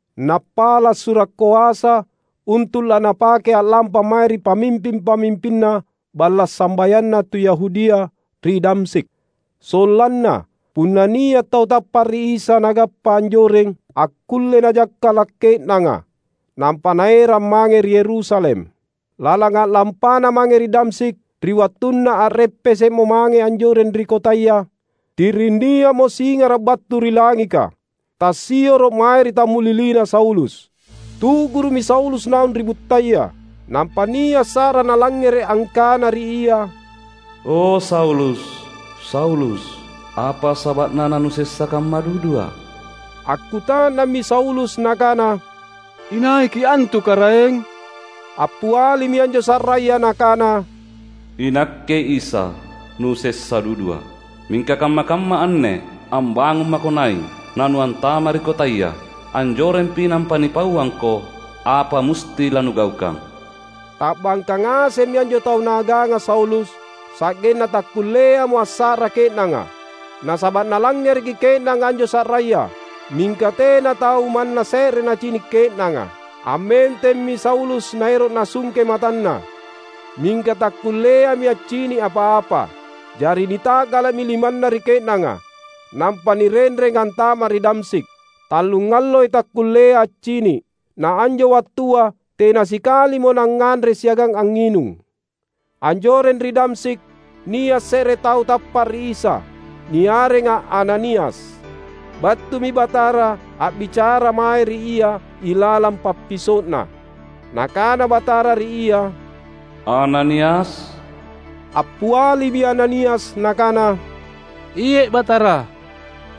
nappala’ sura’ koasa untu’ lanapake a’lampa mae ri pamimping-pamimpinna balla’ sambayanna tu Yahudia ri Damsyik. Sollanna, punna nia’ tau tappa’ ri Isa nagappa anjoreng, akkullei najakkala’ ke’nanga, nampa naerang mange ri Yerusalem. Lalang a’lampana mange ri Damsyik, ri wattunna a’reppese’mo mange anjoreng ri kotaya, ti’ring nia’mo singara’ battu ri langika, tassioro’ mae ri tammulilina Saulus. Tu’guru’mi Saulus naung ri buttaya, nampa nia’ sa’ra nalangngere’ angkana ri ia, "O Saulus, Saulus! Apa saba’na nanusessa kamma duduA’?" Akkuta’nammi Saulus nakana, "InaiKi’ antu, Karaeng?" Appialimi anjo sa’raya nakana, "INakke Isa, nusessa dudua. Mingka kamma-kamma anne ambangung mako nai’, na nuantama’ ri kotaya. Anjorempi nampa nipauangko apa musti lanugaukang." Ta’bangka ngasemmi anjo tau naaganga Saulus sa’genna takkulleamo assa’ra ke’nanga; nasaba’ nalangngereki ke’nanga anjo sa’raya, mingka tena tau manna se’re nacini’ ke’nanga. Ammentemmi Saulus naero’ nasungke matanna, mingka takkulleami accini’ apa-apa. Jari nita’gala’mi limanna ri ke’nanga, nampa nirenreng antama’ ri Damsyik. Tallungalloi takkullea accini’, na anjo wattua tena sikalimo nangnganre siagang angnginung. Anjoreng ri Damsyik nia’ se’re tau tappa’ ri Isa, niarenga Ananias. Battumi Batara a’bicara mae ri ia ilalang pappiso’na. Nakana Batara ri ia, "Ananias!" Appialimi Ananias nakana, "Iye’, Batara."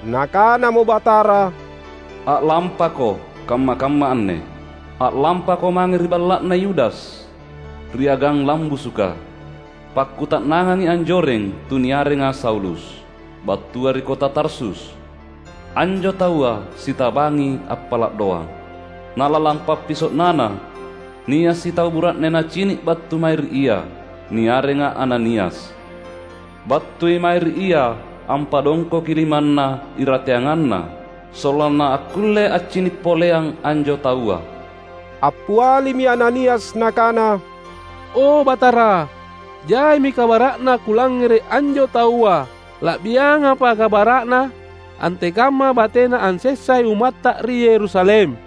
Nakanamo Batara, "A’lampako kamma-kamma anne. A’lampako mange ri balla’na Yudas, ri Agang Lambusuka. Pakkuta’nangangi anjoreng tu niarenga Saulus, battua ri kota Tarsus. Anjo taua sitabangi appala’ doang. Na lalang pappiso’nana, nia’ sitau bura’ne nacini’ battu mae ri ia, niarenga Ananias. Battui mae ri ia ampadongkoki limanna irateanganna sollanna akkulle accini’ poleang anjo taua." Appialimi Ananias nakana, "O Batara, jaimi kabara’na kulangngere’ anjo taua. La’biangampa, kabara’na antekamma batena ansessai ummatTa ri Yerusalem.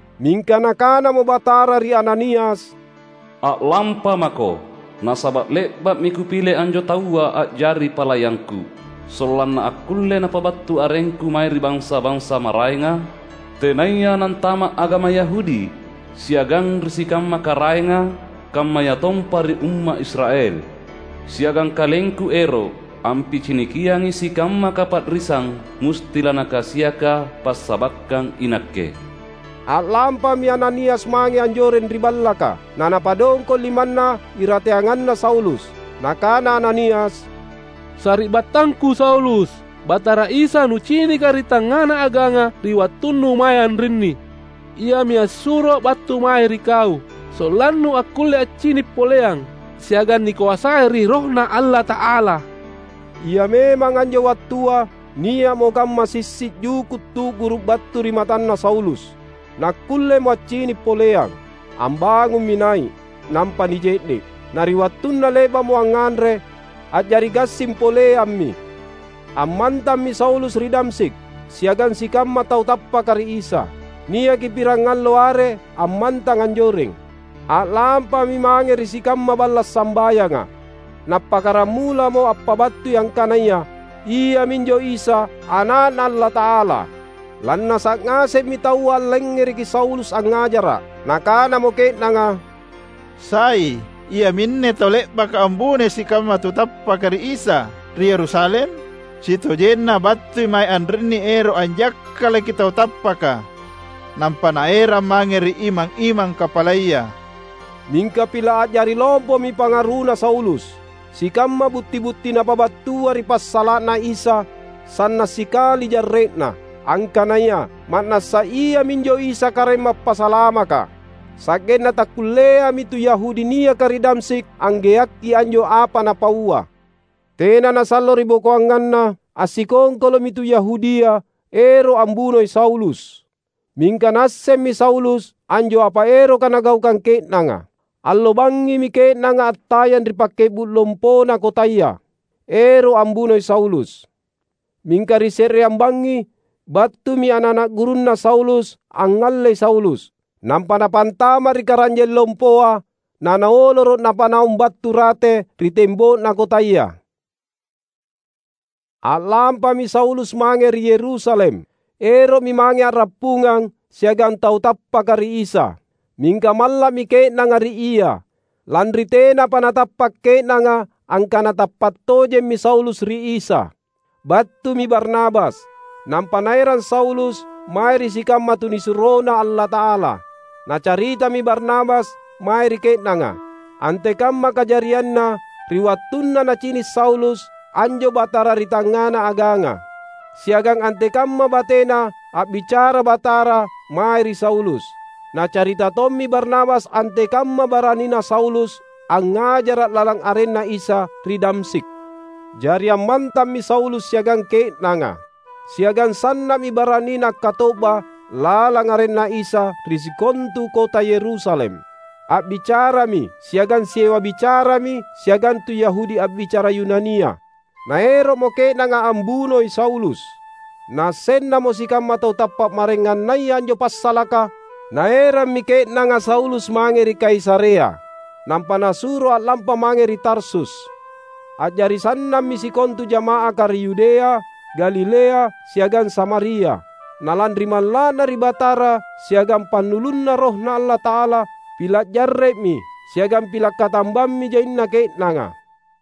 Mingka Nakanamo Batara ri Ananias, "A’lampamako! Nasaba’ le’ba’mi Kupile anjo taua a’jari palayangKu; sollanna akkulle napabattu arengKu mae ri bansa-bansa maraenga, tenaya nantama’ agama Yahudi, siagang ri sikamma karaenga, kammayatompa ri umma’ Israel. Siagang KalengKu ero’ ampicinikiangi sikamma kapa’risang musti lanakasiaka passabakkang iNakke." A’lampami Ananias mange anjoreng ri ballaka, na napadongko’ limanna irateanganna Saulus. Nakana Ananias, "Sari’battangku Saulus, Batara Isa nucinika ri tangngana aganga ri wattunnu mae anrinni, Iami assuroa’ battu mae ri kau, sollannu akkulle accini’ poleang, siagang nikoasai ri RohNa Allata’ala." Ia memang anjo wattua nia’mo kamma sissi’ juku’ tu’guru’ battu ri matanna Saulus, nakkullemo accini’ poleang. Ambangummi nai’, nampa nije’ne’. Na ri wattunna le’ba’mo angnganre, a’jari gassing poleammi. Ammantammi Saulus ri Damsyik, siagang sikamma tau tappaka ri Isa. Niaki pirangallo are ammantang anjoreng. A’lampami mange ri sikamma balla’ sambayanga, nappakkaramulamo ampabattui angkanaya, iaminjo Isa Ana’Na Allata’ala. Lannasa’ ngasemmi taua allangngereki Saulus angngajara’. Nakanamo ke’nanga, "Sai iaminne tau le’baka ambunoi sikamma tau tappaka ri Isa, ri Yerusalem? Sitojenna battui mae anrinni ero’ anjakkalaki tau tappaka, nampa naerang mange ri imang-imang kapalaya!" Mingka pila’ a’jari lompomi pangaruna Saulus. Sikamma butti-butti napabattua ri passala’na Isa sanna’ sikali jarre’na, angkanaya ma’nassa Iaminjo Isa Karaeng Mappasalamaka. Sa’genna takkulleami tu Yahudi niaka ri Damsyik anggeakki anjo apa napaua. Tena nasallo ribokoanganna, assikongkolo’mi tu Yahudia ero’ ambunoi Saulus. Mingka naassemmi Saulus anjo apa eroka nagaukang ke’nanga. Allo bangngimi ke’nanga attayang ri pakke’bu’ lompona kotaya, ero’ ambunoi Saulus. Mingka ri se’reang bangngi, battumi ana’-ana’ gurunna Saulus angngallei Saulus, nampa napantama’ ri karanjeng lompoa nanaoloro’ napanaung battu rate ri tembo’na kotaya. A’lampami Saulus mange ri Yerusalem. Ero’mi mange a’rappungang siagang tau tappaka ri Isa. Mingka malla’mi ke’nanga ri ia, lanri tenapa natappa’ ke’nanga angkana tappa’ tojemmi Saulus ri Isa. Battumi Barnabas, nampa naerang Saulus mae ri sikamma tunisuroNa Allata’ala. Nacaritami Barnabas mae ri ke’nanga, antekamma kajarianna ri wattunna nacini’ Saulus anjo Batara ri tangngana aganga, siagang antekamma batena a’bicara Batara mae ri Saulus. Nacarita tommi Barnabas antekamma baranina Saulus angngajara’ lalang arenNa Isa ri Damsyik. Jari ammantammi Saulus siagang ke’nanga. Siagang sanna’mi baranina akkato’ba lalang arenNa Isa ri sikontu kota Yerusalem. A’bicarami siagang siewa bicarami siagang tu Yahudi a’bicara Yunania; naero’mo ke’nanga ambunoi Saulus. Naassennamo sikamma tau tappa’ maraengannaya anjo passalaka, naerammi ke’nanga Saulus mange ri Kaisarea, nampa nasuro a’lampa mange ri Tarsus. A’jari sannammi sikontu jama’aka ri Yudea, Galilea, siagang Samaria. Na lanri malla’na ri Batara siagang pannulunNa RohNa Allata’ala, pila’ jarre’mi siagang pila’ katambammi jaina ke’nanga.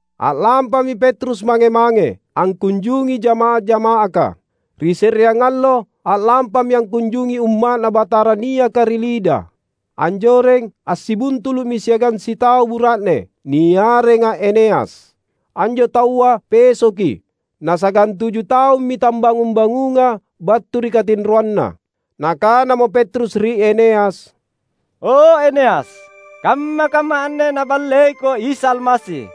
A’lampami Petrus mange-mange, angkunjungi jamaah-jama’aka. Ri se’reang allo a’lampami angkunjungi umma’Na Batara niaka ri Lida. Anjoreng, assibuntulu’mi siagang sitau bura’ne, niarenga Eneas. Anjo taua pesoki, na sagantuju taummi tambangung-bangunga battu ri katinroanna. Nakanamo Petrus ri Eneas, "O Eneas, kamma-kamma anne Naballeiko Isa Almasi.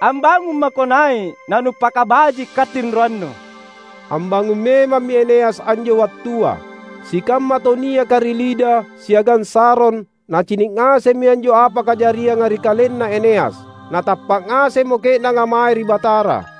Ambangung mako nai’ nanupakabaji’ katinroannu." Ambangung memammi Eneas anjo wattua. Sikamma tau niaka ri Lida siagang Saron nacini’ ngasemmi anjo apa kajarianga ri kalenna Eneas. Na tappa’ ngasemmo ke’nanga mae ri Batara.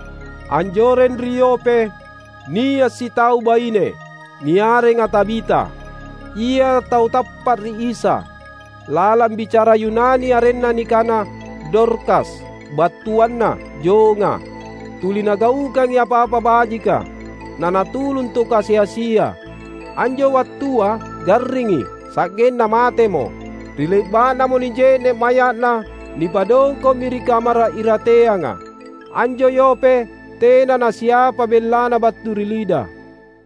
Anjoreng ri Yope, nia’ sitau baine, niarenga Tabita. Ia tau tappa’ ri Isa. (Lalang bicara Yunani arenna nikana, Dorkas, battuanna jonga.) Tuli nagaukangi apa-apa bajika, nanatulung tu kasi-asia. Anjo wattua garringi, sa’genna matemo. Ri le’ba’namo nije’ne’ maya’na, nipadongko’mi ri kamara’ irateanga. Anjo Yope tena nasiapa bellana battu ri Lida.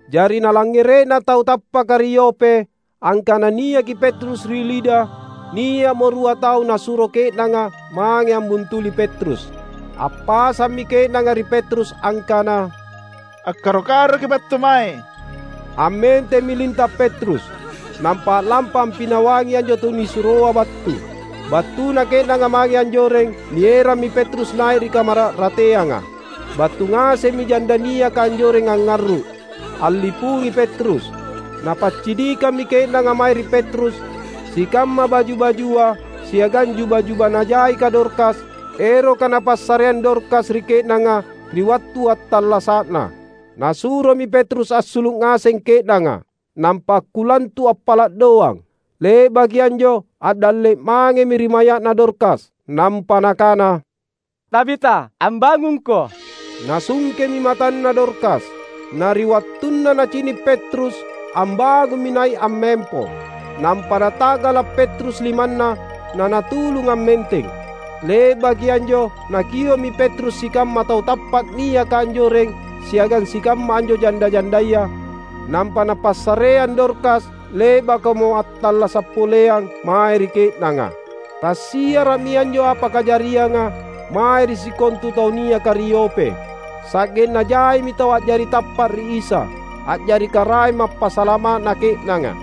Jari nalangngere’na tau tappaka ri Yope angkana niaki Petrus ri Lida, nia’mo rua tau nasuro ke’nanga mange ambuntuli Petrus. Appasammi ke’nanga ri Petrus angkana, "Akkaro-karoki’ battu mae." Ammentemmi linta’ Petrus, nampa a’lampa ampinawangi anjo tunisuroa battu. Battuna ke’nanga mange anjoreng, nierammi Petrus nai’ ri kamara’ rateanga. Battu ngasemmi janda niaka anjoreng angngarru’, allipungi Petrus. Napaccinikammi ke’nanga mae ri Petrus sikamma baju-bajua siagang juba-juba najaika Dorkas, eroka napassareang Dorkas ri ke’nanga ri wattu attallasa’na. Nasuromi Petrus assulu’ ngaseng ke’nanga, nampa akkulantu’ appala’ doang. Le’baki anjo, a’dalle’ mangemi ri maya’na Dorkas, nampa nakana, "Tabita, ambangungko!" Nasungkemi matanna Dorkas; na ri wattunna nacini’ Petrus, ambangummi nai’ ammempo. Nampa nata’gala’ Petrus limanna nanatulung ammenteng. Le’baki anjo nakio’mi Petrus sikamma tau tappa’ niaka anjoreng siagang sikamma anjo janda-jandaya, nampa napassareang Dorkas le’bakamo attallasa’ poleang, mae ri ke’nanga. Tassiara’mi anjo apa kajarianga mae ri sikontu tau niaka ri Yope. Sa’genna jaimi tau a’jari tappa’ ri Isa, a’jari Karaeng Mappasalama’na ke’nanga.